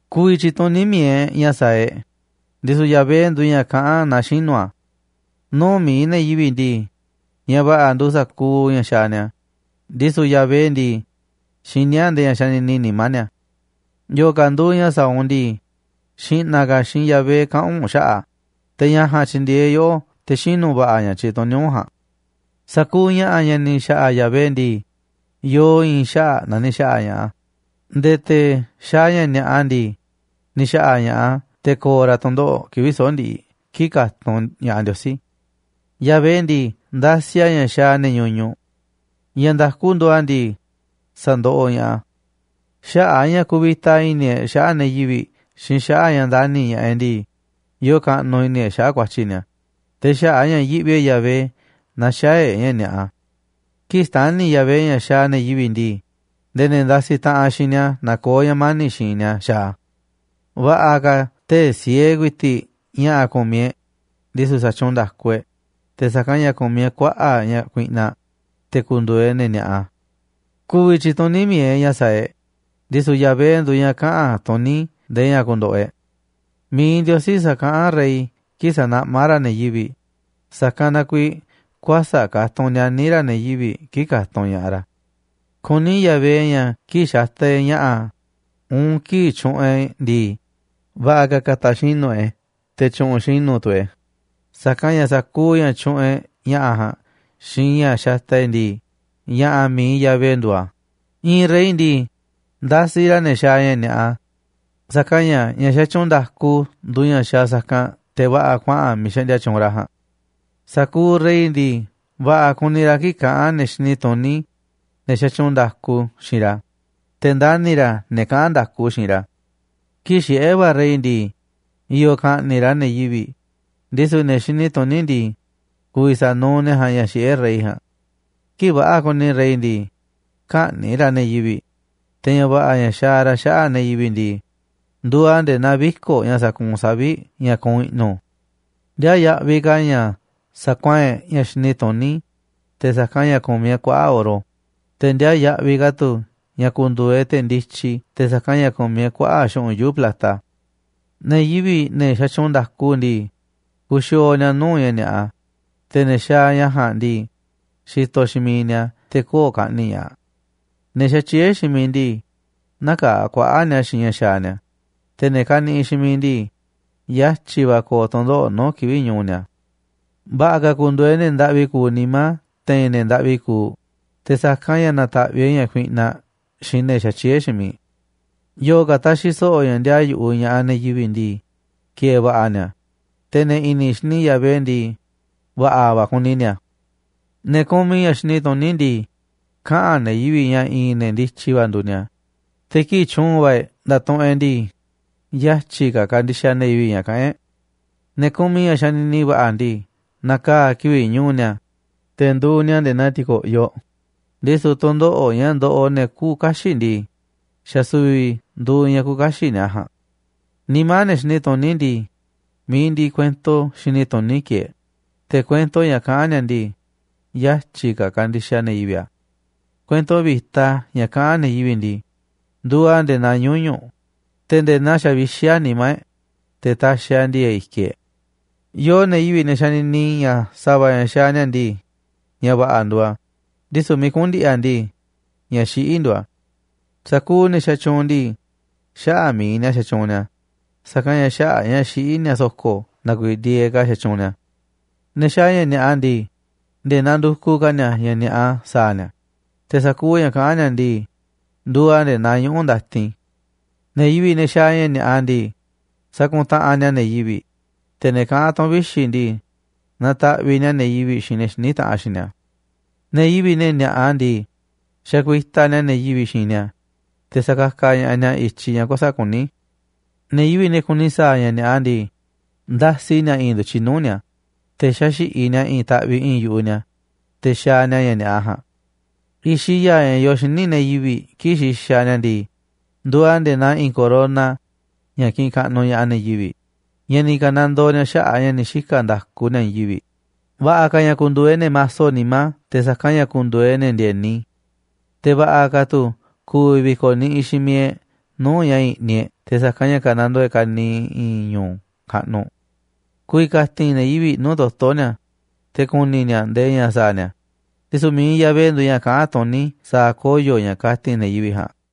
Ku̱vi̱ tyi̱tuní mi̱iꞌ e̱ꞌ ña̱ sa̱a̱ e̱ꞌ, ndisu̱ Yahvé nduuꞌ ña̱ kaꞌán naaꞌ xinu̱ a̱. Nuu̱ꞌ mi̱iꞌ ne̱ yivi̱ꞌ ndii, ña̱ va̱ꞌa̱ nduuꞌ sa̱kuuꞌ ña̱ xaaꞌ ni̱a̱, ndisu̱ Yahvé ndii, xiní a̱ nde̱e̱ ña̱ xanini nimá ni̱a̱. Yo̱o̱ ka̱ nduuꞌ ña̱ sa̱a̱ u̱nꞌ ndii, xi̱ꞌna̱ ka̱ xiinꞌ Yahvé kaꞌa̱n u̱nꞌ xaꞌa̱ꞌ a̱, te̱ ña̱ ja̱a̱nꞌ tyi̱ndi̱e̱eꞌ yoꞌó te̱ xinu̱ va̱ꞌa̱ ña̱ tyituní u̱nꞌ ja̱a̱nꞌ. Sa̱kuuꞌ ña̱ꞌa̱ ña̱ ni̱ xa̱ꞌa̱ Yahvé ndii, yoo i̱i̱n xaꞌa̱ꞌ na ni̱ xa̱ꞌa̱ ña̱ꞌaꞌ a̱, nde̱e̱ te̱ xaaꞌ ña̱ ni̱a̱ꞌa ndii, ni̱ xa̱ꞌa̱ ña̱ꞌaꞌ a̱ te̱ ko̱o̱ ra̱ tu̱ndoꞌo̱ꞌ kivi̱ꞌ soꞌo̱ꞌ ndiꞌiꞌ kii̱ꞌ ka̱tunꞌ ña̱ꞌaꞌ Ndiosí. Yahvé ndii, ndasiꞌ a̱ ña̱ xaaꞌ ne̱ ñuñuꞌ. Ña̱ nda̱ku nduuꞌ a̱ ndii, sa̱ndoꞌoꞌ ña̱ꞌaꞌ a̱. Xaꞌa̱ꞌ a̱ ña̱ kuvita i̱ni̱ e̱ꞌ xaꞌa̱ꞌ ne̱ yivi̱ꞌ xiinꞌ xaꞌa̱ꞌ a̱ ña̱ ndani̱ ña̱ꞌaꞌ e̱ꞌ ndii, yoo kaꞌnuꞌ i̱ni̱ e̱ꞌ xaꞌa̱ꞌ ku̱a̱tyi̱ ni̱a̱, te̱ xaꞌa̱ꞌ a̱ ña̱ yiꞌvi e̱ꞌ Yahvé na xäaꞌ e̱ꞌ ña̱ ni̱a̱ꞌa. Kii̱ꞌ xtani̱ Yahvé ña̱ xaaꞌ ne̱ yivi̱ꞌ ndii, nde̱e̱ ne̱ ndasiꞌ taꞌanꞌ xiinꞌ ni̱a̱ nakoó ña̱ mani̱ꞌ xiinꞌ ni̱a̱ xa̱a̱ a̱. Va̱ꞌa̱ ka̱ tee̱ꞌ siee ku̱i̱ti̱ꞌ ña̱ꞌa̱ ku̱miꞌ e̱ꞌ, ndisu̱ sa̱tyuunꞌ nda̱ku e̱ꞌ, te̱ sa̱kanꞌ ña̱ ku̱miꞌ e̱ꞌ kuaꞌa̱ꞌ ña̱ kuiꞌnaꞌ, te̱ ku̱ndu̱u̱ e̱ꞌ ne̱ ni̱a̱ꞌa. Ku̱vi̱ tyi̱tuní mi̱iꞌ e̱ꞌ ña̱ sa̱a̱ e̱ꞌ, ndisu̱ Yahvé nduuꞌ ña̱ kaꞌa̱n tuní ndee ña̱ ku̱ndo̱ꞌo̱ e̱ꞌ. Mi̱iꞌ Ndiosí sakaꞌán rey kii̱ꞌ sanaꞌmá ra̱ ne̱ yivi̱ꞌ, sa̱kanꞌ na kuiiꞌ kuäsa̱ꞌ katunꞌ nianí ra̱ ne̱ yivi̱ꞌ kii̱ꞌ katunꞌ ña̱ꞌaꞌ ra̱. Kuní Yahvé ña̱ kii̱ꞌ xataꞌ e̱ꞌ ña̱ꞌa̱ uun kii̱ꞌ tyuꞌunꞌ e̱ꞌ e̱ ndii, va̱ꞌa̱ ka̱ ka̱ta̱ xinu̱ e̱ꞌ e̱, te̱ tyu̱ꞌu̱n xinu̱ tu̱ e̱ꞌ e̱, sa̱kanꞌ ña̱ sa̱kuuꞌ ña̱ tyuꞌunꞌ e̱ꞌ ña̱ꞌa̱ ja̱a̱nꞌ xiinꞌ ña̱ xataꞌ e̱ꞌ e̱ ndii, ña̱ꞌa̱ mi̱iꞌ Yahvé nduuꞌ a̱. I̱i̱n rey ndii, ndasiꞌ ra̱ ne̱ xaaꞌ ña̱ ni̱a̱ꞌa, sa̱kanꞌ ña̱ ña̱ xatyuunꞌ nda̱ku nduuꞌ ña̱ xaaꞌ sa̱kanꞌ te̱ va̱ꞌa̱ kuaꞌa̱n miiꞌ xaꞌndia tyuunꞌ ra̱ ja̱a̱nꞌ. Sa̱kuuꞌ rey ndii, va̱ꞌa̱ kuni ra̱ kii̱ꞌ kaꞌán ne̱ xini tuní, ne̱ xatyuunꞌ nda̱ku xiinꞌ ra̱, te̱ ndani̱ ra̱ ne̱ kaꞌán nda̱ku xiinꞌ ra̱. Kii̱ꞌ xiꞌé va̱ rey ndii, i̱yo̱ ka̱ꞌni̱ꞌ ra̱ ne̱ yivi̱ꞌ, ndisu̱ ne̱ xini tuní ndii, ku̱vi̱ sa̱nuuꞌ ne̱ ja̱a̱nꞌ ña̱ xiꞌé rey ja̱a̱nꞌ. Kii̱ꞌ va̱ꞌa̱ kuni rey ndii, kä̱ꞌni̱ꞌ ra̱ ne̱ yivi̱ꞌ, te̱ ña̱ va̱ꞌa̱ ña̱ xaaꞌ ra̱ xaꞌa̱ꞌ ne̱ yivi̱ꞌ ndii, nduuꞌ a̱ nde̱e̱ naa viko̱ꞌ ña̱ sakuunꞌ savi̱ꞌ ña̱ kuunꞌ i̱ꞌnu̱. Ndiaa yaꞌviꞌ ka̱ a̱ ña̱ sa̱kuaa̱n e̱ꞌ ña̱ xini tuní te̱ sa̱kanꞌ ña̱ ku̱miꞌ e̱ꞌ kuaꞌa̱ꞌ oro, te̱ ndiaa yaꞌviꞌ ka̱ tu̱ ña̱ ku̱ndu̱u̱ e̱ꞌ te̱ ndityi te̱ sa̱kanꞌ ña̱ ku̱miꞌ e̱ꞌ kuaꞌa̱ꞌ xu̱ꞌunꞌ yuu̱ꞌ plata. Ne̱ yivi̱ꞌ, ne̱ xatyuunꞌ nda̱ku ndii, kuxiooꞌ ni̱a̱ nuu̱ꞌ ña̱ ni̱a̱ꞌa, te̱ ne̱ xaaꞌ ña̱ ja̱a̱nꞌ ndii, xitoꞌ xiinꞌ miiꞌ ni̱a̱ te̱ köo̱ꞌ ka̱ꞌni̱ꞌ ña̱ꞌaꞌ. Ne̱ xatyié xiinꞌ miiꞌ ndii, nä̱kaa̱ kuaꞌa̱ꞌ ni̱a̱ xiinꞌ ña̱ xaaꞌ ni̱a̱, te̱ ne̱ kaniꞌiꞌ xiinꞌ miiꞌ ndii, yatyi̱ va̱ ko̱o̱ tu̱ndoꞌo̱ꞌ nuu̱ꞌ kivi̱ꞌ ñu̱u̱ ni̱a̱. Va̱ꞌa̱ ka̱ ku̱ndu̱u̱ e̱ꞌ ne̱ ndaꞌvi kuuꞌ nimá te̱i̱n ne̱ ndaꞌvi kuuꞌ te̱ sa̱kanꞌ ña̱ na̱ta̱ꞌviꞌ e̱ꞌ ña̱ kuiꞌnaꞌ xiinꞌ ne̱ xatyieé xiinꞌ miiꞌ. Yo̱o̱ ka̱ taxiꞌ so̱ꞌo̱ ña̱ ndiaa yu̱ꞌuꞌ ña̱ꞌaꞌ ne̱ yivi̱ꞌ ndii, ki̱e̱e̱ va̱ꞌa̱ ni̱a̱, te̱ ne̱ i̱ni̱ xini Yahvé ndii, va̱ꞌa̱ va̱ kuni ni̱a̱. Ne̱ kumiꞌ ña̱ xini tuní ndii, kaꞌa̱n ne̱ yivi̱ꞌ ña̱ i̱i̱n ne̱ ndityi va̱ nduuꞌ ni̱a̱, te̱ kii̱ꞌ tyu̱u̱n va̱ e̱ꞌ nda̱tuꞌunꞌ e̱ꞌ ndii, yatyi̱ ka̱ kandixaꞌ ne̱ yivi̱ꞌ ña̱ kaꞌán e̱ꞌ. Ne̱ kumiꞌ ña̱ xanini va̱ꞌa̱ ndii, na̱kaa̱ kivi̱ꞌ ñu̱u̱ ni̱a̱, te̱ nduuꞌ ni̱a̱ nde̱e̱ naa ti̱ko̱ꞌyoꞌ, ndisu̱ tu̱ndoꞌo̱ꞌ ña̱ ndoꞌoꞌ ne̱ küuꞌ kaxiꞌ ndii, xa̱ su̱vi̱ nduuꞌ ña̱ küuꞌ kaxiꞌ ni̱a̱ ja̱a̱nꞌ. Nimá ne̱ xini tuní ndii, mi̱iꞌ ndiꞌiꞌ kuento xini tuní kieeꞌ, te̱ kuento ña̱ kaꞌán ni̱a̱ ndii, yatyi̱ ka̱ kandixaꞌ ne̱ yivi̱ꞌ a̱. Kuento vi̱ta ña̱ kaꞌán ne̱ yivi̱ꞌ ndii, nduuꞌ a̱ nde̱e̱ naa ñuñu̱ꞌ, te̱ nde̱e̱ naa xavixí a̱ nimá e̱ꞌ, te̱ taxiꞌ a̱ ndi̱e̱e̱ꞌ i̱kiꞌ e̱ꞌ. Yoo ne̱ yivi̱ꞌ, ne̱ xanini ña̱ sa̱va̱ ña̱ xaaꞌ ni̱a̱ ndii, ña̱ va̱ꞌa̱ nduuꞌ a̱, ndisu̱ miiꞌ kuꞌu̱n ndi̱ꞌi̱ a̱ ndii, ña̱ xiꞌí nduuꞌ a̱. Sa̱kuuꞌ ne̱ xatyuunꞌ ndii, xaꞌa̱ꞌ mi̱iꞌ ni̱a̱ xatyuunꞌ ni̱a̱, sa̱kanꞌ ña̱ xaꞌa̱ꞌ a̱ ña̱ xiꞌí ni̱a̱ so̱ko̱ na kuiiꞌ ndi̱e̱eꞌ ka̱ xatyuunꞌ ni̱a̱. Ne̱ xaaꞌ ña̱ ni̱a̱ꞌa ndii, nde̱e̱ nandukuꞌ ka̱ ni̱a̱ ña̱ ni̱a̱ꞌa sa̱a̱ ni̱a̱, te̱ sa̱kuuꞌ ña̱ kaꞌán ni̱a̱ ndii, nduuꞌ a̱ nde̱e̱ naa ñuꞌu̱ ndatin. Ne̱ yivi̱ꞌ, ne̱ xaaꞌ ña̱ ni̱a̱ꞌa ndii, sakuntaꞌanꞌ ni̱a̱ ne̱ yivi̱ꞌ, te̱ ne̱ kaꞌán tu̱ꞌu̱n vixi̱ ndii, nataꞌviꞌ ni̱a̱ ne̱ yivi̱ꞌ xiinꞌ ne̱ xiní taꞌanꞌ xiinꞌ ni̱a̱. Ne̱ yivi̱ꞌ, ne̱ ni̱a̱ꞌa ndii, xakuitaꞌ ni̱a̱ ne̱ yivi̱ꞌ xiinꞌ ni̱a̱, te̱ sakakaꞌ ña̱ꞌaꞌ ni̱a̱ i̱tyiꞌ ña̱ kuäsa̱ꞌ kuní. Ne̱ yivi̱ꞌ, ne̱ kuni sa̱a̱ ña̱ ni̱a̱ꞌa ndii, ndasi ni̱a̱ i̱i̱n ndu̱tyiꞌ nuu̱ꞌ ni̱a̱, te̱ xaxi̱ꞌiꞌ ni̱a̱ i̱i̱n taꞌviꞌ i̱i̱nꞌ yu̱ꞌuꞌ ni̱a̱, te̱ xaaꞌ ni̱a̱ ña̱ ni̱a̱ꞌa ja̱a̱nꞌ. I̱xiꞌ ya̱a̱ ña̱ yoo xíniꞌ ne̱ yivi̱ꞌ kii̱ꞌ xixaꞌ ni̱a̱ ndii, nduuꞌ a̱ nde̱e̱ naa i̱i̱n corona ña̱ kiꞌinꞌ kaꞌnuꞌ ña̱ꞌaꞌ ne̱ yivi̱ꞌ, ña̱ ni̱ ka̱nandoo ni̱a̱ xaꞌa̱ꞌ a̱ ña̱ ni̱ xika̱ nda̱ku ni̱a̱ i̱i̱n yivi̱ꞌ. Va̱ꞌa̱ ka̱ ña̱ ku̱ndu̱u̱ e̱ꞌ ne̱ maso nimá te̱ sa̱kanꞌ ña̱ ku̱ndu̱u̱ e̱ꞌ ne̱ ndi̱e̱ni. Te̱ va̱ꞌa̱ ka̱ tu̱ ku̱vi̱ vi̱ko̱ niꞌiꞌ xiinꞌ miiꞌ e̱ꞌ nuu̱ꞌ ña̱ i̱ni̱ e̱ꞌ te̱ sa̱kanꞌ ka̱nandoo e̱ꞌ ka̱niiꞌ i̱i̱n ñu̱u̱ kaꞌnuꞌ. Ku̱vi̱ ka̱ti̱n ne̱ yivi̱ꞌ nuu̱ꞌ toto̱ ni̱a̱, te̱ ku̱ni̱ ni̱a̱ ndee ña̱ sa̱a̱ ni̱a̱, ndisu̱ mi̱iꞌ Yahvé nduuꞌ ña̱ kaꞌán tuní sa̱a̱ koyo̱ ña̱ kati̱n ne̱ yivi̱ꞌ ja̱a̱nꞌ.